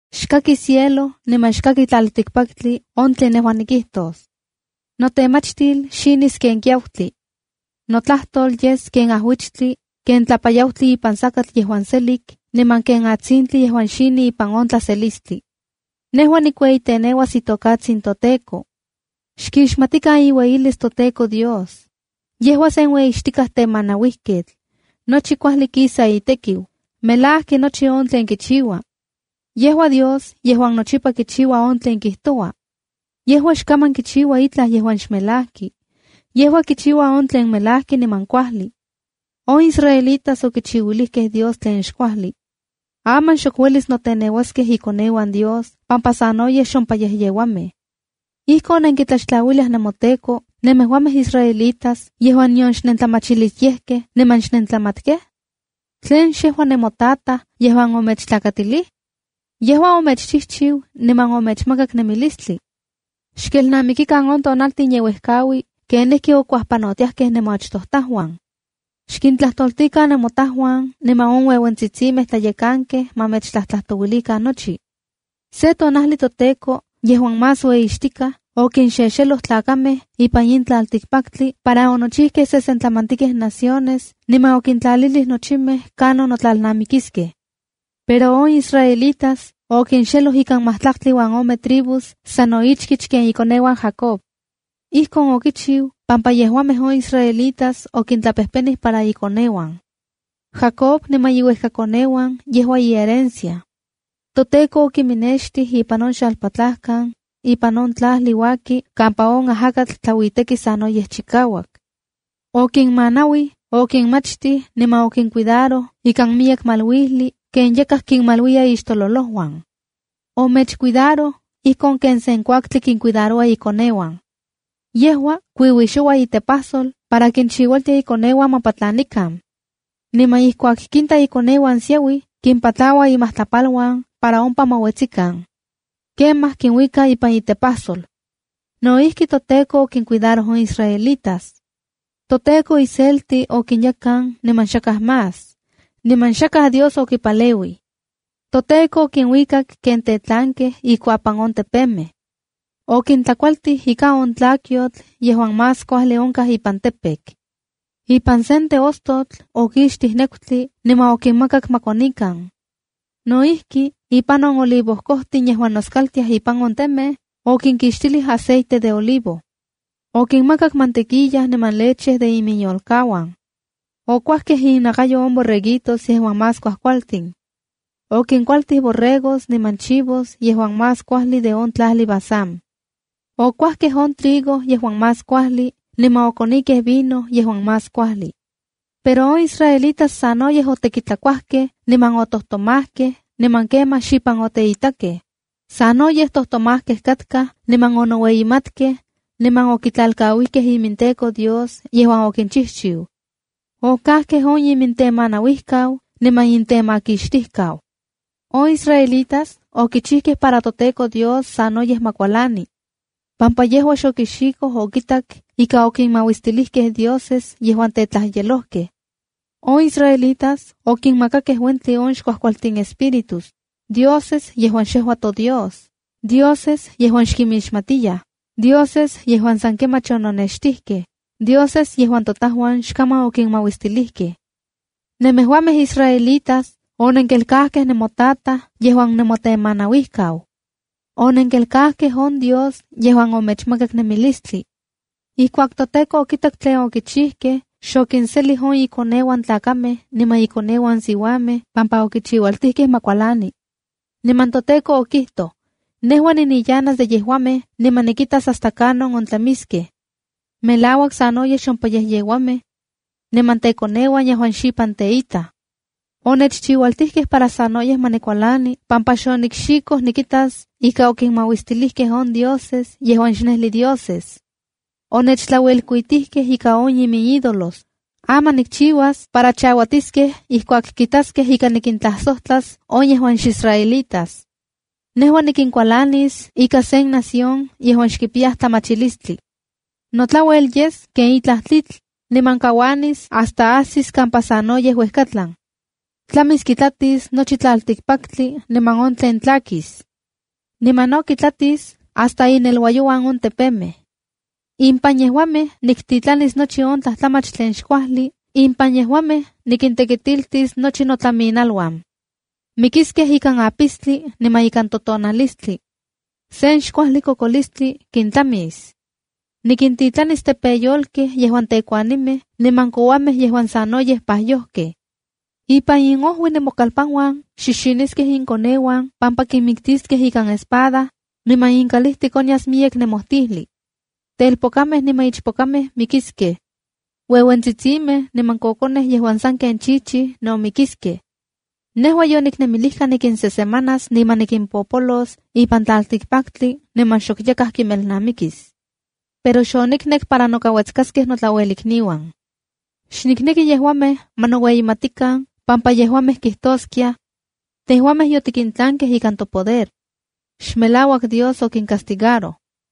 “Xkaki cielo, niman xkaki on tlaltikpaktli on tlen nejua nikijtos. ’Notemachtil xinis ken kiautli. Notlajtol yes ken ajuichtli, ken tlapayautli ipan sakatl yejuan selik, niman ken atsintli yejuan xini ipan on tlaselistli. ’Nejua nikueyiteneuas itokatsin toTEKO. ¡Xkixmatikan iueyilis toTEKO Dios! Yejua sen ueyixtika temanauijketl. Nochi kuajli kisa itekiu. Melajki nochi on tlen kichiua. Yejua Dios yejuan nochipa kichiua on tlen kijtoua. Yejua xkaman kichiua itlaj yejuan xmelajki. Yejua kichiua on tlen melajki niman kuajli. ’On israelitas okichiuilijkej Dios tlen xkuajli. Aman xok uelis noteneuaskej ikoneuan Dios pampa sanoyej xompayejyeuamej. ¿Ijkon nenkitlaxtlauilia nemoTEKO, nemejuamej israelitas yejuan nion xnentlamachilisyejkej niman xnentlamatkej? ¿Tlen xejua nemotataj yejuan omechtlakatili? ¡Yejua omechchijchiu niman omechmakak nemilistli! ’Xkelnamikikan on tonaltin yeuejkaui kenijki okuajpanotiajkej nemoachtojtajuan. Xkintlajtoltikan nemotajuan niman on ueuentsitsimej tlayekankej ma mechtlajtlatouilikan nochi. Se tonajli toTEKO yejuan Más Ueyixtikaj, okinxexeloj tlakamej ipan in tlaltikpaktli para onochijkej sesentlamantikej naciones, niman okintlalilij nochimej kanon notlalnamikiskej. Pero on israelitas okinxeloj ikan matlaktli uan ome tribus sano ichkich ken ikoneuan Jacob. Ijkon okichiu pampa yejuamej on israelitas okintlapejpenij para ikoneuan. Jacob niman iuejkakoneuan yejua iherencia. ToTEKO okiminextij ipan on xalpatlajkan, ipan on tlajli uaki kampa on ajakatl tlauiteki sanoyej chikauak. Okinmanauij, okinmachtij niman okincuidaroj ikan miyek maluijli ken yakaj kinmaluiya ixtololouan. Omechcuidaroj ijkon ken sen kuaktli kincuidaroua ikoneuan. Yejua kuiuixoua itepajsol para kinchiualtia ikoneuan ma patlanikan. Niman ijkuak kinta ikoneuan siauij, kimpatlaua imajtlapaluan para ompa ma uetsikan. Kemaj kinuika ipan itepajsol. No ijki, toTEKO okincuidaroj on israelitas. ’ToTEKO iselti okinyekan niman xakaj más. Niman xakaj dios okipaleuij. ToTEKO okinuikak ken tetlankej ikuapan on tepemej. Okintlakualtij ika on tlakyotl yejuan más kuajli onkaj ipan campo. Ipan sen teostotl okixtij nekutli, niman okinmakak ma konikan. No ijki, ipan on olivojkojtin yejuan noscaltiaj ipan on temej, okinkixtilij aceite de olivo. Okinmakak mantequilla niman leche de iminyolkauan. Okuajkej innakayo on borreguitos yejuan más kuajkualtin. Okinkualtij borregos niman chivos yejuan más kuajli de on tlajli Basán. Okuajkej on trigo yejuan más kuajli, niman okonikej vino yejuan más kuajli. ’Pero on israelitas sanoyej otekitlakuajkej niman otojtomajkej, niman kemaj xipan oteitakej. Sanoyej tojtomajkej katkaj niman onoueyimatkej, niman okitlalkauijkej iminTEKO Dios yejuan okinchijchiu. Okajkej on imintemanauijkau niman imintemakixtijkau. On israelitas okichijkej para toTEKO Dios sanoyej ma kualani, pampa yejua xokixikoj okitak ika okinmauistilijkej dioses yejuan tetlajyelojkej. On israelitas okinmakakej uentli on xkuajkualtin espíritus, dioses yejuan xejua toDios, dioses yejuan xkinmixmatiyaj, dioses yejuan san kemach ononextijkej, dioses yejuan totajuan xkaman okinmauistilijkej. ’Nemejuamej israelitas, onenkelkajkej nemotataj yejuan nemotemanauijkau. Onenkelkajkej on Dios yejuan omechmakak nemilistli. Ijkuak toTEKO okitak tlen okichijkej, xokinselij on ikoneuan tlakamej niman ikoneuan siuamej pampa okichiualtijkej ma kualani. Niman toTEKO okijtoj: ‘Nejua niniyanas de yejuamej, niman nikitas hasta kanon ontlamiskej. Melauak sanoyej xompayejyeuamej, niman tekoneuan yejuan xipan teitaj. Onechchiualtijkej para sanoyej ma nikualani pampa xonikxikoj nikitas ika okinmauistilijkej on dioses yejuan xnejli dioses. Onechtlauelkuitijkej ika on iminídolos. Aman nikchiuas para chauatiskej ijkuak kitaskej ika nikintlajsojtlas on yejuan xisraelitas. Nejua nikinkualanis ika sen nación yejuan xkipiyaj tlamachilistli. Notlauel yes ken itlaj tlitl, niman kauanis hasta ajsis kampa sanoyej uejkatlan. Tlamis kitlatis nochi tlaltikpaktli niman on tlen tlakis. Niman no kitlatis hasta ineluayouan on tepemej. Impan yejuamej niktitlanis nochi on tlajtlamach tlen xkuajli, impan yejuamej nikintekitiltis nochi notlaminaluan. Mikiskej ikan apistli niman ikan totonalistli. Sen xkuajli kokolistli kintlamis. Nikintitlanilis tepeyolkej yejuan tekuanimej niman kouamej yejuan sanoyej pajyojkej. Ipan inojui nemokalpanuan xixiniskej inkoneuan pampa kinmijmiktiskej ikan espada, niman inkalijtik onyas miyek nemojtijli. Telpokamej niman ichpokamej mikiskej. Ueuentsitsimej niman kokonej yejuan sanken chichij no mikiskej. ’Nejua yoniknemilijka nikinsesemanas niman nikimpolos ipan tlaltikpaktli niman xok yakaj kinmelnamikis. Pero xoniknek para nokauetskaskej notlauelikniuan. Xnikneki yejuamej ma noueyimatikan, pampa yejuamej kijtoskiaj: Tejuamej yotikintlankej ikan topoder. Xmelauak Dios okincastigaroj.’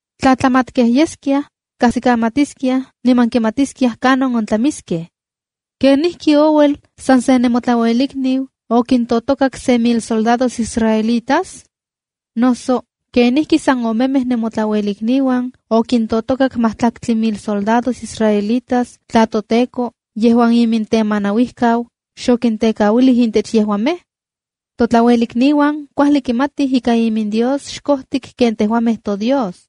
Tla tlamatkej yeskiaj, kajsikamatiskiaj niman kimatiskiaj kanon ontlamiskej. ¿Kenijki ouel san se nemotlauelikniu okintotokak se mil soldados israelitas? Noso, ¿kenijki san omemej nemotlauelikniuan okintotokak matlaktli mil soldados israelitas tla toTEKO, yejuan imintemanauijkau, xokintekauilij intech yejuamej? ’Totlauelikniuan kuajli kimatij ika imindios xkojtik ken tejuamej toDios.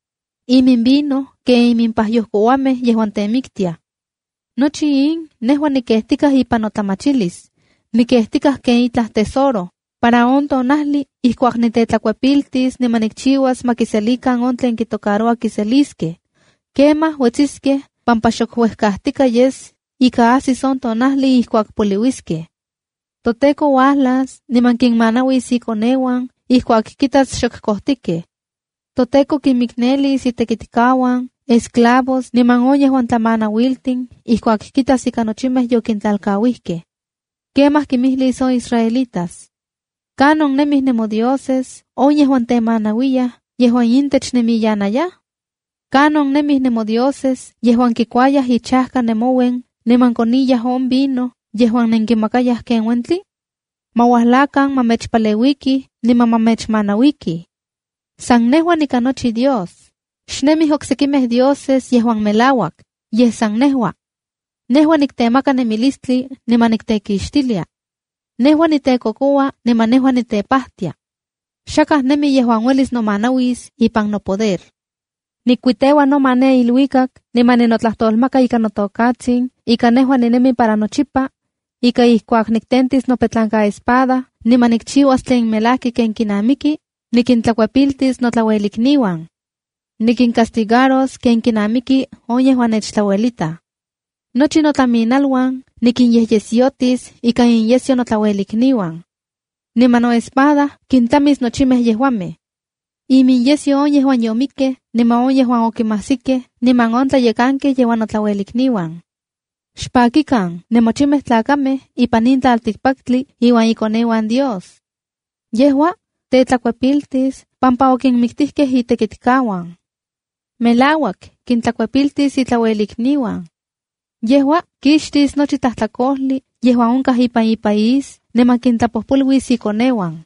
Iminvino ken iminpajyoj kouamej yejuan temiktiaj. ’Nochi in nejua nikejtikaj ipan notlamachilis. Nikejtikaj ken itlaj tesoro, para on tonajli ijkuak nitetlakuepiltis niman nikchiuas ma kiselikan on tlen kitocaroua kiseliskej. Kemaj uetsiskej pampa xok uejkajtika yes ika ajsis on tonajli ijkuak poliuiskej. ’ToTEKO uajlas niman kinmanauis ikoneuan ijkuak kitas xok kojtikej. ToTEKO kinmiknelis itekitkauan, esclavos niman on yejuan tlamanauiltin ijkuak kitas ika nochimej yokintlalkauijkej. Kemaj kimijlis on israelitas: ¿Kanon nemij nemodioses, on yejuan temanauiyaj yejuan intech nenmiyanayaj? ¿Kanon nemij nemodioses yejuan kikuayaj ichajka nemouen, niman koniyaj on vino yejuan nenkinmakayaj ken uentli? Ma uajlakan para ma mechpaleuikij, niman ma mechmanauikij. San nejua nikanochi Dios. Xnemij oksekimej dioses yejuan melauak, yej san nejua. Nejua niktemaka nemilistli niman niktekixtilia. Nejua nitekokoua niman nejua nitepajtia. ¡Xakaj nemi yejuan uelis nomanauis ipan nopoder! Nikuiteua noma ne iluikak, niman ninotlajtolmaka ika notokatsin ika nejua ninemi para nochipa, ika ijkuak niktentis nopetlankaespada niman nikchiuas tlen melajki ken kinamiki, nikintlakuepiltis notlauelikniuan. ¡Nikincastigaros ken kinnamiki on yejuan nechtlauelitaj! Nochi notlaminaluan nikinyejyesyotis ika inyesyo notlauelikniuan. Niman noespada kintlamis nochimej yejuamej: iminyesyo on yejuan yomikkej, niman on yejuan okinmajsikej, niman on tlayekankej yejuan notlauelikniuan. ’¡Xpakikan, nemochimej tlakamej ipan tlaltikpaktli iuan ikoneuan Dios! Yejua tetlakuepiltis pampa okinmiktijkej itekitkauan. Melauak, kintlakuepiltis itlauelikniuan. Yejua kixtis nochi tlajtlakojli yejuan onkaj ipan ipaís, niman kintlapojpoluis ikoneuan.”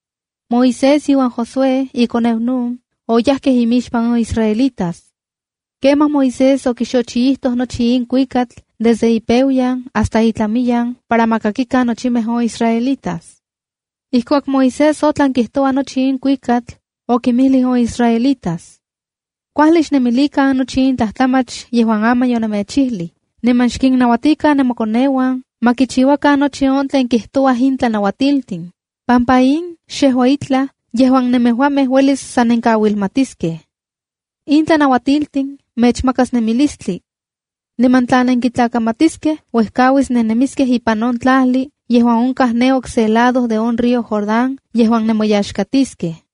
Moisés, iuan Josué ikoneu Nun, oyajkej imixpan on israelitas. Kemaj Moisés okixochiijtoj nochi in kuikatl desde ipeuayan hasta itlamiyan para ma kakikan nochimej on israelitas. Ijkuak Moisés otlan kijtoua nochi in kuikatl, okinmijlij on israelitas: “Kuajli xnemilikan nochi on tlajtlamach yejuan aman yonemechijli. Niman xkinnauatikan nemokoneuan ma kichiuakan nochi on tlen kijtouaj in tlanauatiltin, pampa in xejua itlaj yejuan nemejuamej uelis san nenkauilmatiskej. In tlanauatiltin mechmakas nemilistli. Niman tla nenkintlakamatiskej uejkauis nennemiskej ipan on tlajli yejuan onkaj ne okse lado de on río Jordán yejuan nemoyaxkatiskej.”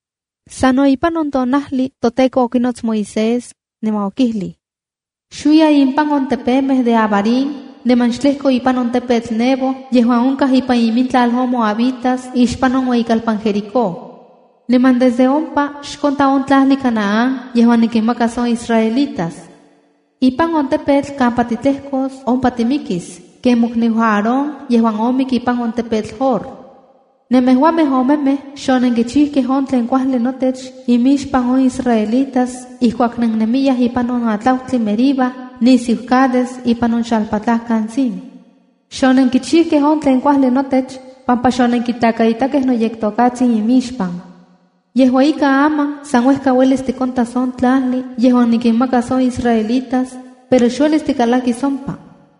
Sano ipan in tonajli toTEKO okinots Moisés, niman okijlij: “Xuiya impan on tepemej de Abarim niman xtlejko ipan on tepetl Nebo yejuan onkaj ipan imintlal on moabitas ixpan on ueyikalpan Jericó. Niman desde ompa xkonta on tlajli Canaán yejuan nikinmakas on israelitas. Ipan on tepetl kampa titlejkos ompa timikis, ken mokniu Aarón yejuan omik ipan on tepetl Hor. Nemejuamej omemej xonenkichijkej on tlen kuajli notech imixpan on israelitas ijkuak nennemiyaj ipan on atlautli Meriba nisiu Cades ipan on xalpatlajkan Zin. Xonenkichijkej on tlen kuajli notech pampa xotiktlakaitakej noyektotajtsin inmixpan. Yejua ika aman, san uejka uelis tikontas on tlajli yejuan nikinmakas on israelitas, pero xuelis tikalakis ompa.”